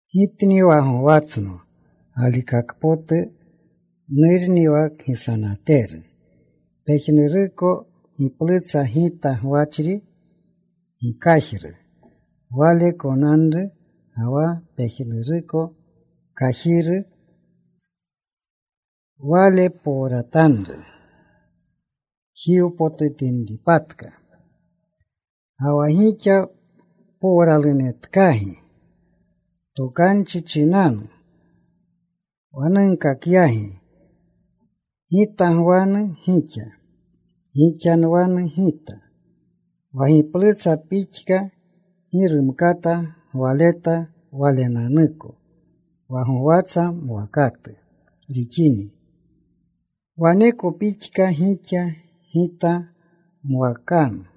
“Gitni wa gowatsno galikakpotu. Nurni wa kgisanateru. Pejnuruko giplutsa Gita gwachri, gi kajru, Wale konanru. Ga wa pejnuruko kajiru Wale powratanru jiwpotutinripatka. Ga wa gixa powralunetkagi tokanchi chinanu wa nunkakyagi. Gita gwanu gixa. Gixa nwanu Gita. Wa giplutsa pixka gi rumkata gwaleta walenanuko, wa gowatsa mwakatu rixini, waneko pixka gixa, Gita gmawakanu.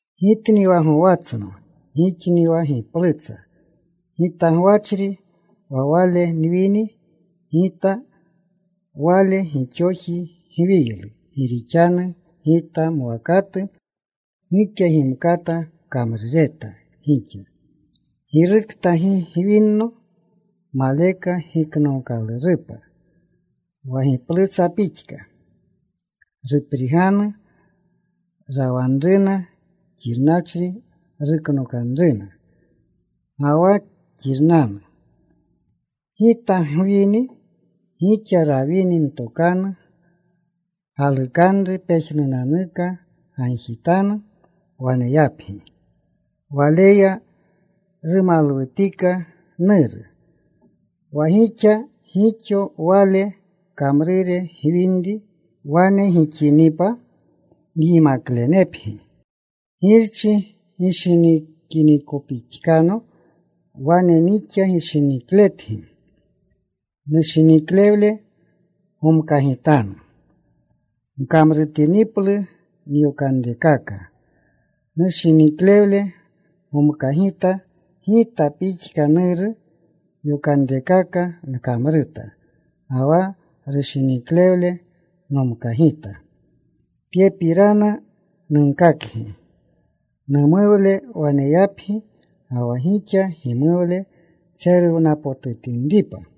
“Gitni wa gowatsno. Gixni wa giplutsa. Gita gwachri, wa wale nwini Gita, wale gixoji gwiylu. Gi rixanu Gita mwakatu gike gimkata kamrureta gixa. Girukta gi gwinno, maleka giknookalurupa wa giplutsa pixka. Rupriganu. Rawanruna. Xirnachri ruknokanruna, ga wa xirnanu. Gita gwini. Gixa rawini ntokanu, galukanru pejnunanuka gagjitanu. Waneyapgi. Waleya rumalwutika Nuru, wa gixa gixo Wale kamrure gwinri. Wane gixinipa nyimaklenepgi. “Girchi gishinikinikopixkano, wane nixa gishinikletgi. Nushiniklewle gomkagitanu. Gkamrutiniplu nyokanrekaka nushiniklewle gomkagita. Gita pixka Nuru yokanrekaka nkamruta ga wa rushiniklewle nomkagita. Tyepirana nunkakgi, numuwle waneyapgi, ga wa gixa gimuwle tseruwnapotutinripa.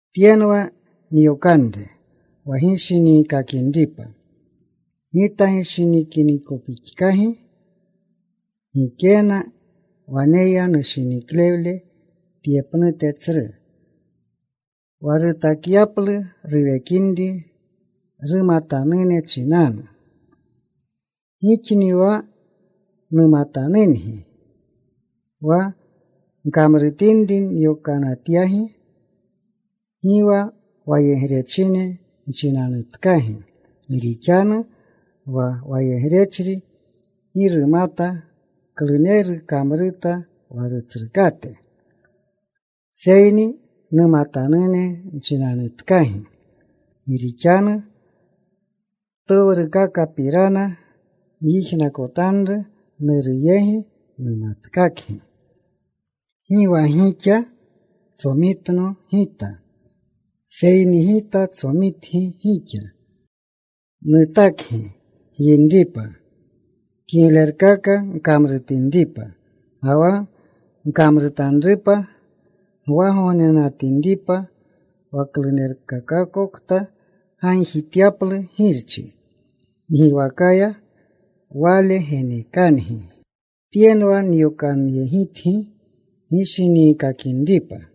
“Tyenwa nyokanre, wa gishiniikakinripa, Gita gishinikinikopixkagi. Gikena waneya rushiniklewle tye pnute tsru, wa rutakyaplu ruwekinri rumatanune chinanu. Gixni wa numatanungi wa gkamrutinri nyokanatyagi. Gi wa wayegrechine nchinanutkagi, gi rixanu wa wayegrechri gi rumata kluneru kamruta wa rutsrukate. Seyni numatanune nchinatkagi, gi rixanu ptowrukakapirana nyijnakotanru Nuru yegi, numatkakgi. Gi wa gixa tsomitno Gita, seyni Gita tsomitgi gixa. Nutakgi gyinripa, kiglerkaka gkamrutinripa, ga wa gkamrutanrupa gwagognenatinripa, wa klunerukokta gagjityaplu Girchi ngiwakaya Wale genekangi. Tyenwa nyokanyegitgi, gishiniikakinripa.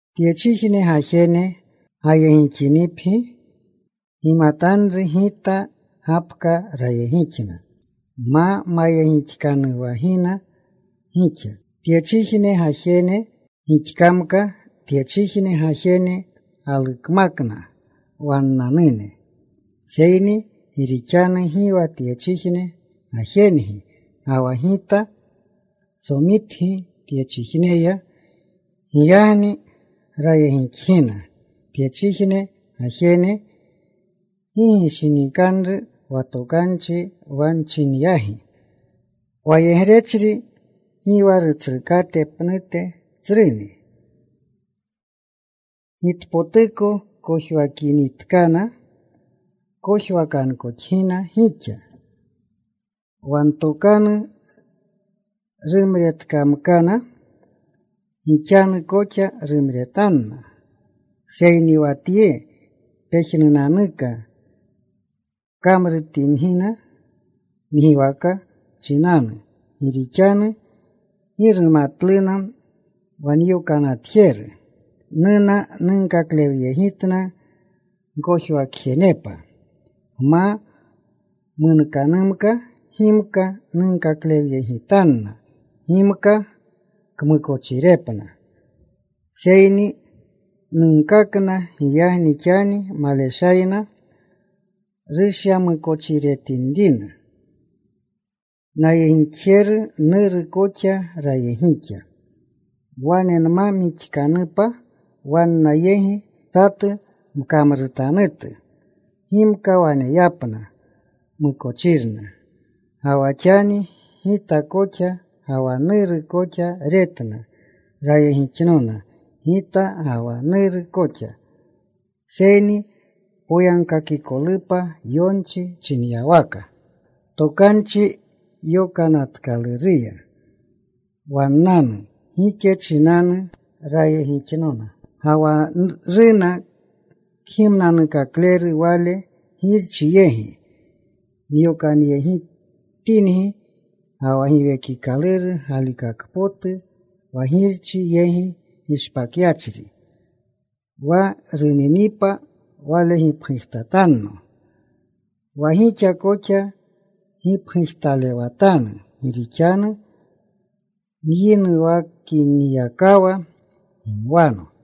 “Tyechijne gajene gayegixinipgi, gimatanru Gita gapka rayegixna ma mayegixkanuwagina gixa. Tyechijne gajene gixkamka, tyechijne gajene galukmakna wannanune. Seyni gi rixanu gi wa tyechijne gajengi ga wa Gita tsomitgi tyechijneya, giyagni rayegixgina tyechijne gajene. Gishinikanru wa tokanchi wa nchinyagi: Wayegrechri gi wa rutsrukate pnute tsruni. Gitpotuko kojwakinitkana, kojwakankoxgina gixa. Wa ntokanu rumretkamkana, gixanu koxa rumretanna. Seyni wa tye pejnunanuka kamrutingina ngiwaka chinanu, gi rixanu gi rumatluna wa nyokanatjeru. Nuna. Nunkaklewywgitna gkojwakjenepa. Nma munkanumka, gimka nunkaklewyegitanna, gimka kmukochirepna, seyni nunkakna. Giyagni xani maleshayna rushyamukochiretinrina. Nayegixjeru Nuru koxa rayegixa. Wane nma mixkanupa wanna yegi, satu mkamrutanutu, gimka waneyapna mukochirna. Ga wa xani Gita koxa ga wa Nuru koxa retna. Rayegixnona Gita ga Nuru koxa. Seyni poyagkakikolupa yonchi chinyawaka Tokanchi Yokanatkaluruya wannanu: Gike chinanu rayegixnona. “Ga wa runanu Kgimnanukakleru, Wale Girchi yegi nyokanyegitangi, wa Giwekikaluru galikakpotu, wa Girchi yegi gishpakyachri. Wa runinipa, Wale gipgujtatanno. Wa gixa koxa gipgujtalewatanu gi rixanu nyinuwakinyakawa gimwano.